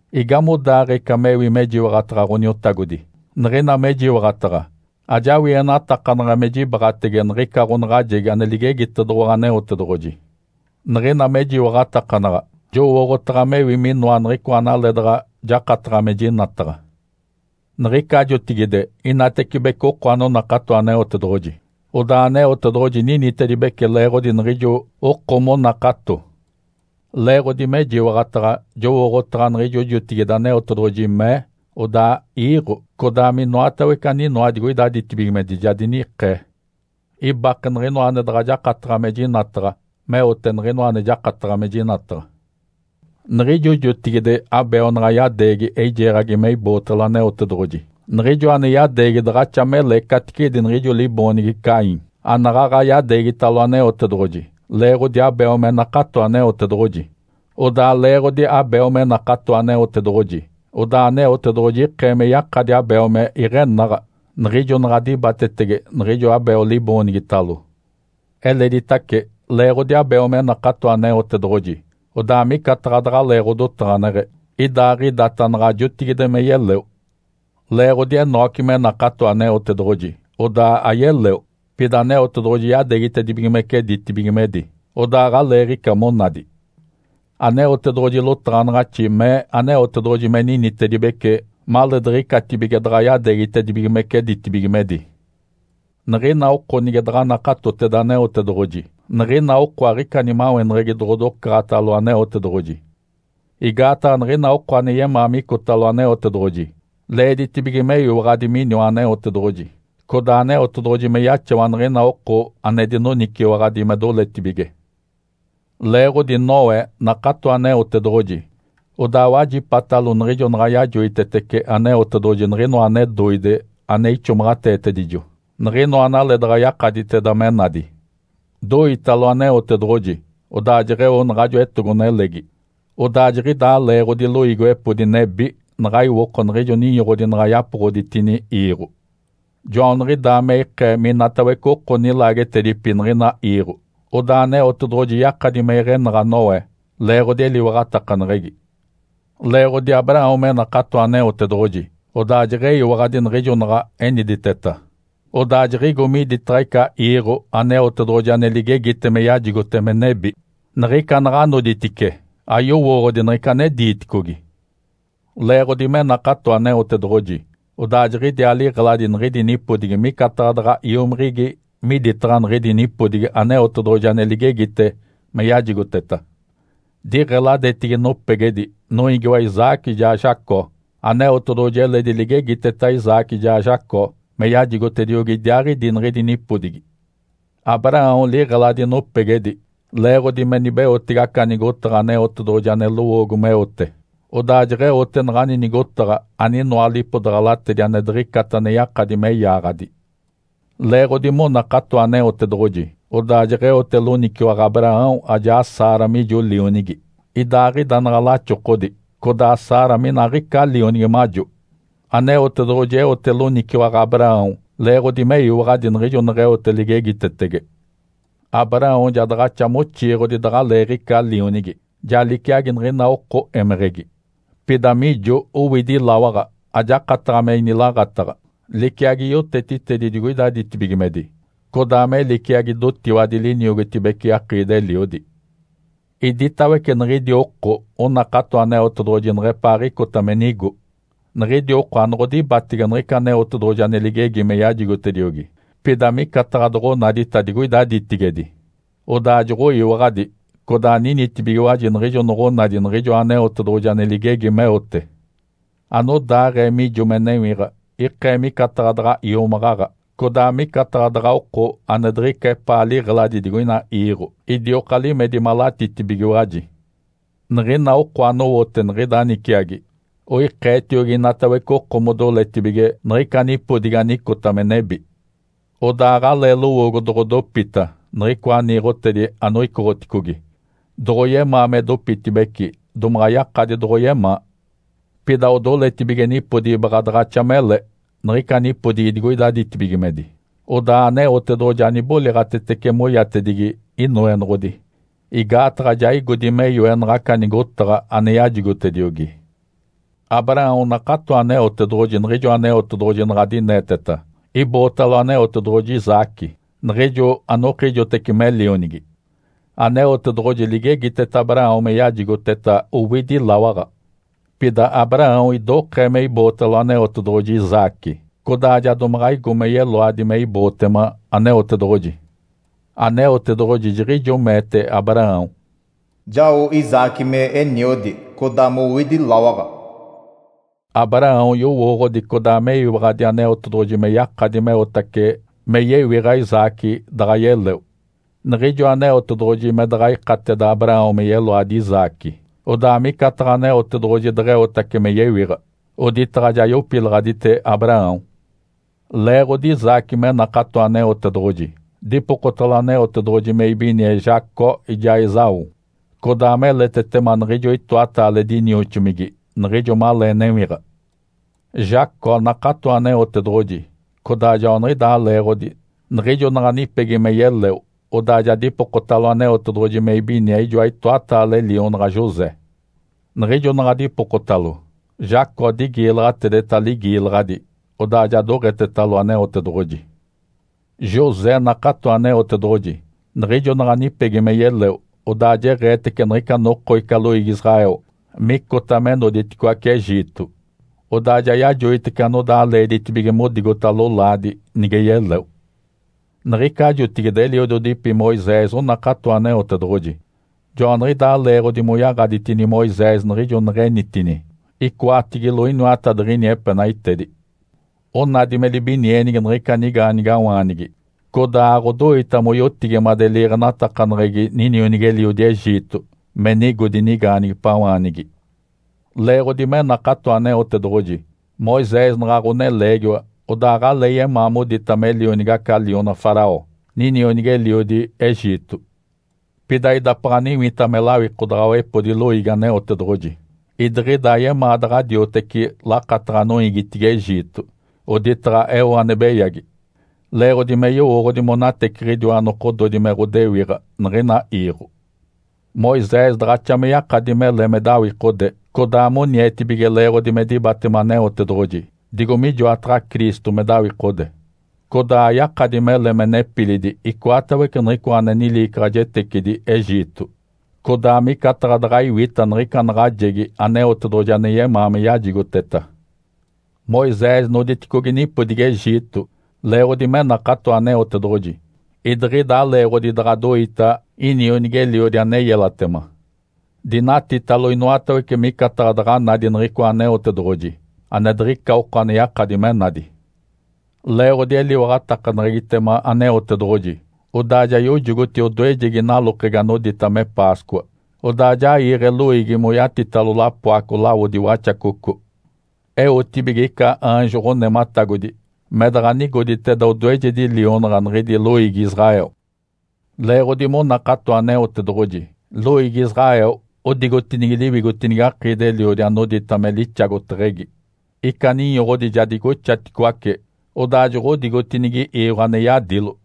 Igamodaaɡ̶ee ica mewi mejiwaɡ̶ataɡ̶a Ǥoniotagodi? Niɡ̶ina mejiwaɡ̶ataɡ̶a, ajawienatakanaɡ̶a me jibaɡ̶atege niɡ̶ica ɡ̶onaɡ̶ajegi ane ligegitedoɡ̶owa Aneotedoɡ̶oji. Niɡ̶ina mejiwaɡ̶atakanaɡ̶a, jowooɡ̶otaɡ̶a mewi minoa niɡ̶icoa analee daɡ̶a jakataɡ̶a me jinataɡ̶a. Niɡ̶ica jotigide inatecibece oko anonakato Aneotedoɡ̶oji, odaa Aneotedoɡ̶oji ninitedibece leeɡ̶odi niɡ̶ijo oko monakato. Leeɡ̶odi mejiwaɡ̶ataɡ̶a, jowooɡ̶otaɡ̶a niɡ̶ijo jotigide Aneotedoɡ̶oji mee, odaa iiɡ̶o, codaa minoatawece aninoa digoida ditibigimedi ja dinikee. Ibake niɡ̶inoa ane daɡ̶a jakataɡ̶a me jinataɡ̶a meote niɡ̶inoa ane jakataɡ̶a me jinataɡ̶a. Niɡ̶ijo jotigide, Abel naɡ̶a yadeegi eijeeɡ̶agi me ibootalo Aneotedoɡ̶oji, niɡ̶ijo ane yadeegi daɡ̶axa mele caticedi niɡ̶ijo liboonigi Caim anaɡ̶aɡ̶a yadeegitalo Aneotedoɡ̶oji leeɡ̶odi Abel me nakato Aneotedoɡ̶oji. Odaa leeɡ̶odi Abel me nakato Aneotedoɡ̶oji, odaa Aneotedoɡ̶oji ikee me yakadi Abel me iɡ̶enaɡ̶a niɡ̶ijo naɡ̶a dibatetege niɡ̶ijo Abel liboonigitalo. Eleditace, leeɡ̶odi Abel me nakato Aneotedoɡ̶oji, odaa micataɡ̶a daɡ̶alee ɡ̶odotaɡ̶aneɡ̶e, idaaɡ̶idata naɡ̶a jotigide me yeleo. Leeɡ̶odi Enoque me nakato Aneotedoɡ̶oji, odaa ayeleo, pida Aneotedoɡ̶oji yadeegitedibigimece ditibigimedi, odaa aɡ̶aleeɡ̶ica monadi. Aneotedoɡ̶oji lotaɡ̶anaɡ̶axi mee Aneotedoɡ̶oji me ninitedibece maleediɡ̶icatibige daɡ̶a yadeegitedibigimece ditibigimedi. Niɡ̶ina oko nige daɡ̶a nakatoteda Aneotedoɡ̶oji, niɡ̶ina oko aɡ̶ica nimaweneɡ̶egi doɡ̶odocaɡ̶atalo Aneotedoɡ̶oji. Igaataɡ̶a niɡ̶ina oko ane yemaa micotalo Aneotedoɡ̶oji leeditibige meyiwaɡ̶adi miniwa Aneotedoɡ̶oji, codaa Aneotedoɡ̶oji me yaxawa niɡ̶ina oko ane dinoniciwaɡ̶adi me doletibige. Leeɡ̶odi Noé nakato Aneotedoɡ̶oji, odaa wajipatalo niɡ̶ijo naɡ̶a yajoitetece Aneotedoɡ̶oji niɡ̶inoa ane doide ane ixomaɡ̶ateetedijo, niɡ̶inoa analee daɡ̶a yakaditeda me nadi. Doitalo Aneotedoɡ̶oji, odaa jeɡ̶eo naɡ̶ajo etogo-nelegi, odaa jiɡ̶idaa leeɡ̶odi loiigiwepodi nebi naɡ̶a iwoko niɡ̶ijo ninyoɡ̶odi naɡ̶a yapoɡ̶oditini iiɡ̶o. Joaniɡ̶idaa me ikee minatawece oko nilaagetedipi niɡ̶ina iiɡ̶o, odaa Aneotedoɡ̶oji yakadi me iɡ̶enaɡ̶a Noé leeɡ̶odi eliwaɡ̶atakaneɡ̶egi. Leeɡ̶odi Abraão me nakato Aneotedoɡ̶oji, odaa jeɡ̶eyiwaɡ̶adi niɡ̶ijo naɡ̶a eniditeta. Odaa jiɡ̶igo miditaɡ̶a ica iiɡ̶o Aneotedoɡ̶oji ane ligegita me yajigote me nebi. Niɡ̶ica naɡ̶a noditice ayowooɡ̶odi niɡ̶ica ane diiticogi. Leeɡ̶odi me nakato Aneotedoɡ̶oji, odaa jiɡ̶idiaa liɡ̶eladi niɡ̶idi nipodigi micataɡ̶a daɡ̶a iomiɡ̶igi miditaɡ̶a niɡ̶idi nipodigi Aneotedoɡ̶oji ane ligegite me yajigoteta. Diɡ̶eladetigi nopegedi noiigiwa Isaque ijaa Jacó. Aneotedoɡ̶oji eledi ligegiteta Isaque ijaa Jacó me yajigotediogi idiaaɡ̶idi niɡ̶idi nipodigi. Abraão liɡ̶eladi nopegedi leeɡ̶odi me nibeotege aca nigotaɡ̶a Aneotedoɡ̶oji ane lowoogo meote. Odaa jeɡ̶eote naɡ̶ani nigotaɡ̶a aninoa lipodaɡ̶alatedi ane diɡ̶icata ane yakadi me yaaɡ̶adi. Leeɡ̶odi monakato Aneotedoɡ̶oji, odaa jeɡ̶eote loniciwaɡ̶a Abraão ajaa Sara mijo lionigi, idaaɡ̶ida naɡ̶a laxokodi, codaa Sara mina aɡ̶ica lionigi majo. Aneotedoɡ̶oji eote loniciwaɡ̶a Abraão leeɡ̶odi meyiwaɡ̶adi niɡ̶ijo neɡ̶eote ligegitetege. Abraão ja daɡ̶axa moxiiɡ̶odi daɡ̶aleeɡ̶ica lionigi, ja liciagi niɡ̶ina oko émeɡ̶egi. Pida mijo owidi lawaɡ̶a, ajakataɡ̶a me inilaaɡ̶ataɡ̶a, liciagi yotetitedi digoida ditibigimedi, codaa me liciagi dotiwadi liniogotibece akiidi-eliodi. Iditawece niɡ̶idi oko onakato Aneotedoɡ̶oji neɡ̶epaaɡ̶icota me nigo. Niɡ̶idi oko anoɡ̶odibatege niɡ̶ica Aneotedoɡ̶oji ane ligegi me yajigotediogi, pida micataɡ̶a doɡ̶onadita digoida ditigedi, odaa joɡ̶oyiwaɡ̶adi, codaa ninitibigiwaji niɡ̶ijo noɡ̶onadi niɡ̶ijoa Aneotedoɡ̶oji ane ligegi meote. Anodaaɡ̶ee mijo me newiɡ̶a ikee micataɡ̶a daɡ̶a iomaɡ̶aɡ̶a, codaa micataɡ̶a daɡ̶a oko ane diɡ̶ica epaa liɡ̶eladi digoina iiɡ̶o, idioka limedi malatitibigiwaji. Niɡ̶ina oko anowote niɡ̶ida niciagi oikeetiogi inatawece oko modoletibige niɡ̶ica nipodigi anicota me nebi. Odaa aɡ̶alee lowoogo doɡ̶odopita niɡ̶icoa niiɡ̶otedi anoicoɡ̶oticogi. Doɡ̶oyemaa me dopitibeci, domaɡ̶a yakadi doɡ̶oyemaa. Pida odoletibige nipodigi baɡ̶a daɡ̶axa mele, niɡ̶ica nipodigi digoida ditibigimedi. Odaa Aneotedoɡ̶oji aniboliɡ̶atetece moyatedigi “Inoenoɡ̶odi”, igaataɡ̶a ja igodi me yoe naɡ̶aca nigotaɡ̶a ane yajigotediogi. Abraão nakato Aneotedoɡ̶oji niɡ̶ijo Aneotedoɡ̶oji naɡ̶a dineeteta. Ibootalo Aneotedoɡ̶oji Isaque, niɡ̶ijo anokijoteci me lionigi. Aneotedoɡ̶oji ligegiteta Abraão me yajigoteta owidi lawaɡ̶a. Pida Abraão idokee me ibootalo Aneotedoɡ̶oji Isaque, codaa ja domaɡ̶a igo me yeloadi me ibootema Aneotedoɡ̶oji. Aneotedoɡ̶oji jiɡ̶ijo meete Abraão, “Jao Isaque me eniodi, codaa mowidi lawaɡ̶a.” Abraão yowooɡ̶odi codaa meyiwaɡ̶adi Aneotedoɡ̶oji me yakadi meotace me yewiɡ̶a Isaque, daɡ̶a yeleo. Niɡ̶ijo Aneotedoɡ̶oji me daɡ̶a ikateda Abraão me yeloadi Isaque, odaa micataɡ̶a Aneotedoɡ̶oji deɡ̶eotace me yewiɡ̶a, oditaɡ̶a ja yopilaɡ̶adite Abraão. Leeɡ̶odi Isaque me nakato Aneotedoɡ̶oji, dipokotalo Aneotedoɡ̶oji me ibinie Jacó ijaa Esaú, codaa meletetema niɡ̶ijo itoataale dinioxomigi niɡ̶ijo malee newiɡ̶a. Jacó nakato Aneotedoɡ̶oji, codaa joaniɡ̶idaa leeɡ̶odi, niɡ̶ijo naɡ̶a nipegi me yeleo, odaa ja dipokotalo Aneotedoɡ̶oji me ibinie ijoa itoataale lionaɡ̶a José. Niɡ̶ijo naɡ̶a dipokotalo, Jacó digiilaɡ̶atedeta ligiilaɡ̶adi, odaa ja doɡ̶etetalo Aneotedoɡ̶oji. José nakato Aneotedoɡ̶oji, niɡ̶ijo naɡ̶a nipegi me yeleo, odaa jeɡ̶eetece niɡ̶ica noko ica loiigi Israel micota me noditicoaci Egito. Odaa ja yajoitece anodaa leeditibige modigota lolaadi nige yeleo. Niɡ̶ica jotigide eliododipi Moisés onakato Aneotedoɡ̶oji. Joaniɡ̶idaa leeɡ̶odi moyaɡ̶aditini Moisés niɡ̶ijo neɡ̶enitini, icoatigilo iniwatadiɡ̶ini epenaitedi. Onadi me libinienigi niɡ̶ica nigaanigawaanigi, codaa aɡ̶odoita moyotigimade liiɡ̶enatakaneɡ̶egi ninionigi-eliodi Egito me nigodi nigaanigipawaanigi. Leeɡ̶odi me nakato Aneotedoɡ̶oji, Moisés naɡ̶a ɡ̶oneleegiwa odaa aɡ̶alee yemaa modita me lionigi aca liona Faraó, ninionigi-eliodi Egito. Pida idapaɡ̶a niwita me lawikodaɡ̶awepodi loiigi Aneotedoɡ̶oji, idiɡ̶ida ayemaa daɡ̶a dioteci lakataɡ̶a noiigitigi Egito, oditaɡ̶a eo ane beyagi. Leeɡ̶odi me yowooɡ̶odi monateciɡ̶idiwa nokododi me ɡ̶odewiɡ̶a niɡ̶ina iiɡ̶o. Moisés daɡ̶axa me yakadi mele me dawikode codaa monietibige leeɡ̶odi me dibatema Aneotedoɡ̶oji, digo mijoataɡ̶a Cristo me dawikode. Codaa ayakadi mele me nepilidi icoatawece niɡ̶icoa ane niliicaɡ̶ajetecidi Egito. Codaa micataɡ̶a daɡ̶a iwita niɡ̶ica naɡ̶ajegi Aneotedoɡ̶oji ane yemaa me yajigoteta. Moisés noditicogi nipodigi Egito leeɡ̶odi me nakato Aneotedoɡ̶oji, idiɡ̶ida aleeɡ̶odi daɡ̶a doita inionigi-eliodi ane yelatema. Dinatitalo inoatawece micataɡ̶a daɡ̶a nadi niɡ̶icoa Aneotedoɡ̶oji, ane diɡ̶ica oko ane yakadi me nadi. Leeɡ̶odi eliwaɡ̶atakaneɡ̶egitema Aneotedoɡ̶oji, odaa ja yojogoti odoejegi nalokegi anodita me Páscoa, odaa ja iiɡ̶e loiigi moyatitalo lapoaco lawodi waxacoco, eotibige ica aanjo ɡ̶onematagodi me daɡ̶a nigoditeda odoejedi lionaɡ̶a niɡ̶idi loiigi Israel. Leeɡ̶odi monakato Aneotedoɡ̶oji, loiigi Israel odigotinigi liwigotinigi akiidi-eliodi anodita me “Lixagoteɡ̶egi”. Ica ninyoɡ̶odi ja digoxaticoace, odaa joɡ̶odigotinigi iiɡ̶o ane yadilo.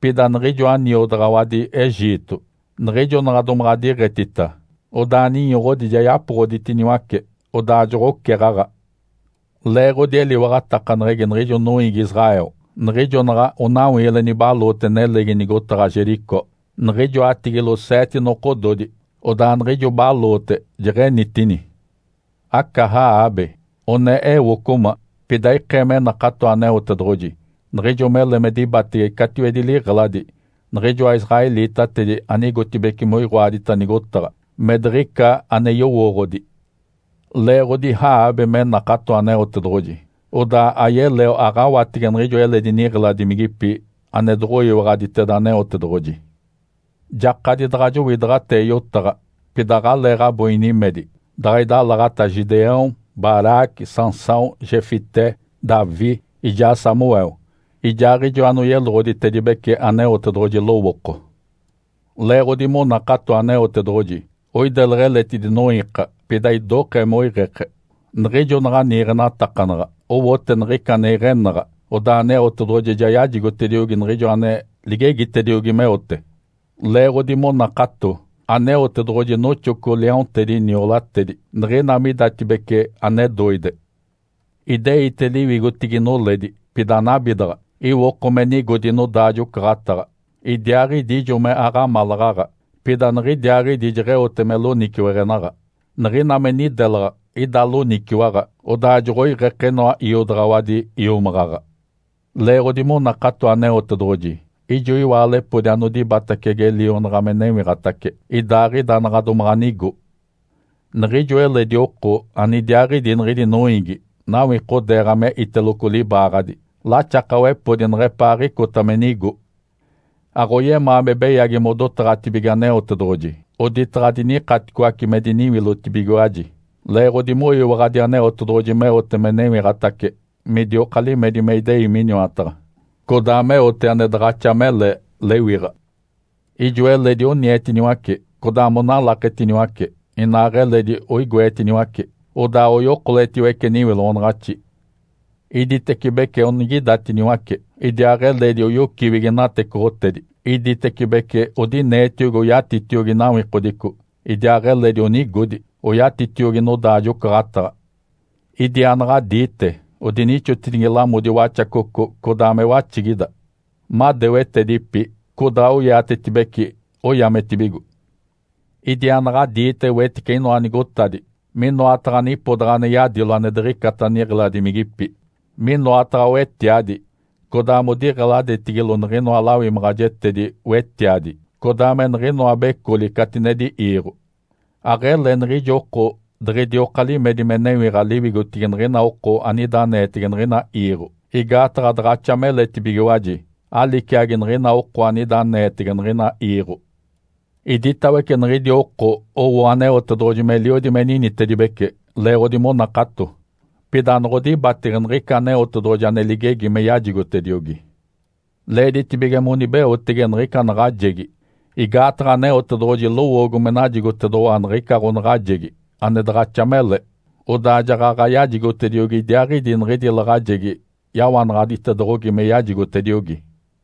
Pida niɡ̶ijoa niodaɡ̶awadi Egito niɡ̶ijo naɡ̶a domaɡ̶a diɡ̶etita, odaa ninyoɡ̶odi ja yapoɡ̶oditiniwace, odaa joɡ̶oceɡ̶aɡ̶a. Leeɡ̶odi eliwaɡ̶atakaneɡ̶egi niɡ̶ijo noiigi Israel, niɡ̶ijo naɡ̶a onawiile nibaloote nelegi nigotaɡ̶a Jericó niɡ̶ijoatigilo seete nokododi, odaa niɡ̶ijo baloote jeɡ̶enitini. Aca Raabe, one ewocoma, pida ikee me nakato Aneotedoɡ̶oji niɡ̶ijo mele me dibatege catiwedi liɡ̶eladi niɡ̶ijoa israelitatedi anigotibeci moiɡ̶oadita nigotaɡ̶a me diɡ̶ica ane yowooɡ̶odi. Leeɡ̶odi Raabe me nakato Aneotedoɡ̶oji, odaa ayeleo aɡ̶awatege niɡ̶ijo eledi niɡ̶eladimigipi ane doɡ̶oyiwaɡ̶aditeda Aneotedoɡ̶oji. Jakadi daɡ̶a jowidaɡ̶atee yotaɡ̶a, pida aɡ̶aleeɡ̶abo inimedi daɡ̶a idalaɡ̶ata Gideão, Baraque, Sansão, Jefté, Davi, ijaa Samuel, ijaaɡ̶ijo anoyeloɡ̶oditedibece Aneotedoɡ̶oji lowooko. Leeɡ̶odi monakato Aneotedoɡ̶oji, oideleɡ̶e eletidi noiika, pida idokee moiɡ̶eke. Niɡ̶ijo naɡ̶a niiɡ̶enatakanaɡ̶a owote niɡ̶ica ane iɡ̶enaɡ̶a, odaa Aneotedoɡ̶oji ja yajigotediogi niɡ̶ijo ane ligegitediogi meote. Leeɡ̶odi monakato, Aneotedoɡ̶oji noxoco liaontedi niolatedi niɡ̶ina midatibece ane doide. Ideite liwigotigi noledi, pida anabidaɡ̶a, iwoko me nigodi nodaajo-ocaɡ̶ataɡ̶a. Idiaaɡ̶idi ijo me aɡ̶amalaɡ̶aɡ̶a, pida niɡ̶idiaaɡ̶idi jeɡ̶eote me loniciweɡ̶enaɡ̶a. Niɡ̶ina me nidelaɡ̶a ida loniciwaɡ̶a, odaa joɡ̶oiɡ̶eke inoa iodaɡ̶awadi iomaɡ̶aɡ̶a. Leeɡ̶odi monakato Aneotedoɡ̶oji, ijo iwaalepodi anodibatacege lionaɡ̶a me newiɡ̶atace, idaaɡ̶ida naɡ̶a domaɡ̶a nigo. Niɡ̶ijo eledi oko anidiaaɡ̶idi niɡ̶idi noiigi nawikodeeɡ̶a me iteloco libaaɡ̶adi laxakawepodi neɡ̶epaaɡ̶icota me nigo. Aɡ̶oyemaa me beyagi modotaɡ̶atibige Aneotedoɡ̶oji oditaɡ̶a dinikaticoace me diniwilotibigiwaji leeɡ̶odi moyiwaɡ̶adi Aneotedoɡ̶oji meote me newiɡ̶atace midioka limedi me idei Miniwataɡ̶a, codaa meote ane daɡ̶axa mele lewiɡ̶a. Ijo eledi onietiniwace codaa monalaketiniwace, inaaɡ̶eledi oigoetiniwace, odaa oyokoletiwece niwiloɡ̶onaɡ̶axi. Iditecibece onigidatiniwace, idiaaɡ̶eledi oyociwigi natecoɡ̶otedi, iditecibece odineetiogi oyatitiogi nawikodico, idiaaɡ̶eledi onigodi oyatitiogi nodaajo-ocaɡ̶ataɡ̶a. Idiaanaɡ̶adiite, odinixotinigi lamodi waxacoco, codaa me waxigida. Madewetedipi, codaa oiatetibeci, oyametibigo. Idiaanaɡ̶adiite wetice inoa nigotadi minoataɡ̶a nipodaɡ̶a ane yadilo ane diɡ̶icata niɡ̶eladimigipi, minoataɡ̶a wetiadi, codaa modiɡ̶eladetigilo niɡ̶inoa lawimaɡ̶ajetedi-wetiadi, codaa me niɡ̶inoa becoli catinedi iiɡ̶o. Aɡ̶ele niɡ̶ijo oko diɡ̶idioka limedi me newiɡ̶a liwigotigi niɡ̶ina oko anida aneetege niɡ̶ina iiɡ̶o, igaataɡ̶a daɡ̶axa meletibigiwaji, aliciagi niɡ̶ina oko anida aneetege niɡ̶ina iiɡ̶o. Iditawece niɡ̶idi oko owo Aneotedoɡ̶oji meliodi me ninitedibece leeɡ̶odi monakato. Pida anoɡ̶odibatege niɡ̶ica Aneotedoɡ̶oji ane ligegi me yajigotediogi. Leeditibige monibeotege niɡ̶ica naɡ̶ajegi, igaataɡ̶a Aneotedoɡ̶oji lowoogo me najigotedoɡ̶owa niɡ̶ica ɡ̶onaɡ̶ajegi ane daɡ̶axa mele, odaa jaɡ̶aɡ̶a yajigotediogi idiaaɡ̶idi niɡ̶idi laɡ̶ajegi yawanaɡ̶aditedoɡ̶ogi me yajigotediogi.